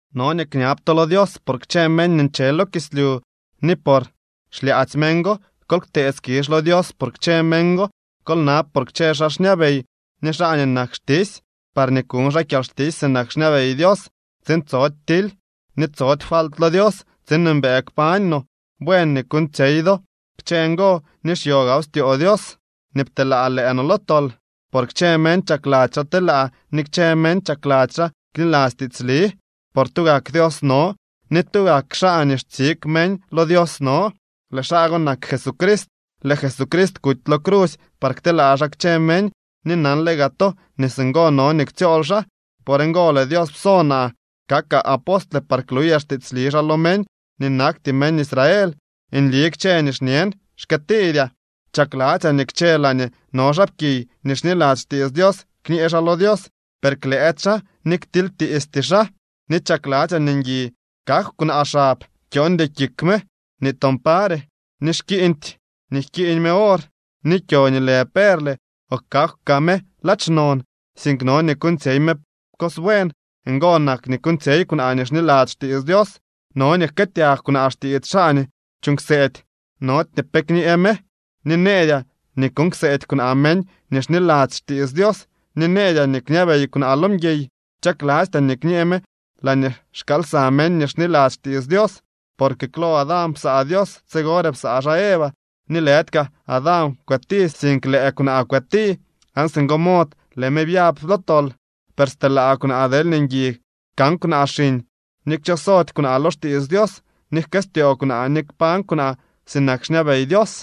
No nii kñab to lo Dios por kchë meñ nii nche lo kislyu ni por xlyaadzy meñ go. Kol ktee skizh lo Dios por kchë meñ go. Kol nab por kchë xaa xñabey ni xaa nii nak xtisy, parñee kuñ xaa kyalxtisy sinak xñabey Dios, tsiin tsody tily ni tsody falt lo Dios tsiin mbëë kpañ no. Buen nii kuuñtsyey do kchë ngo ni xyo gaaw styoo Dios nii pteelaa lëë no lo tol, por kchë meñ chakladzy xaa telaa ni kchë meñ chakladzy xaa kniladzy tiitsli. Por tugak Dios no, ni tugak xaa nii xtsig meñ lo Dios no. Lëë xaa go nak Jesucrist. Lëë Jesucrist kuty lo crusy par kteelaa xaa kchë meñ, ni nanle gaa to nii singo no nii ktsyool xaa. Por ngo lëë Dios pso naa kakaa apostle par kluyaa xtiitsli xaa lo meñ nii nakty meñ Israel. Nli kchë nii xñen, xkëëtiidyaa. Chakladzyaa nii kchë laañee no xaapkiy nii xniladzy xtiits Dios, kñee xaa lo Dios, per klëëdy xaa ni ktilytiisty xaa. Ni chakladzyaa nii ngui kakw kwnaa xab. Kyooñdy kik me nii toon pare, ni xkiiñdy nii jkiiñ me or, ni kyo nii lë perle o kakw kaa me ladx non, sink no nii kuuñtsyey me cos buen. Ngo nak nii kuuñtsyey kwnaa nii xniladzy xtiits Dios. No nii jkëëtyag kwnaa xtiits xaa nii chuuñ kseedy, nody ni pe kñee me. Ni nëëdyaa nii kuuñ kseedy kwnaa meñ nii xniladzy xtiits Dios ni nëëdyaa nii kñabey kwnaa lo mguiy. Chaklastyaa nii kñee me laañee xkaal lsa meñ nii xniladzy xtiits Dios. Porque klo Adán psaa Dios, tsigore psaa xaa Eva. Ni lëdy kaa Adán kwëti, sink lëë kwnaa kwëti, aan singo mod lëë me byab lo tol. Per stelaa kwnaa deelñee ngui kan kwnaa xiñ ni kchosody kwnaa lo xtiits Dios, ni jkëstyoo kwnaa, ni kpañ kwnaa sinak xñabey Dios.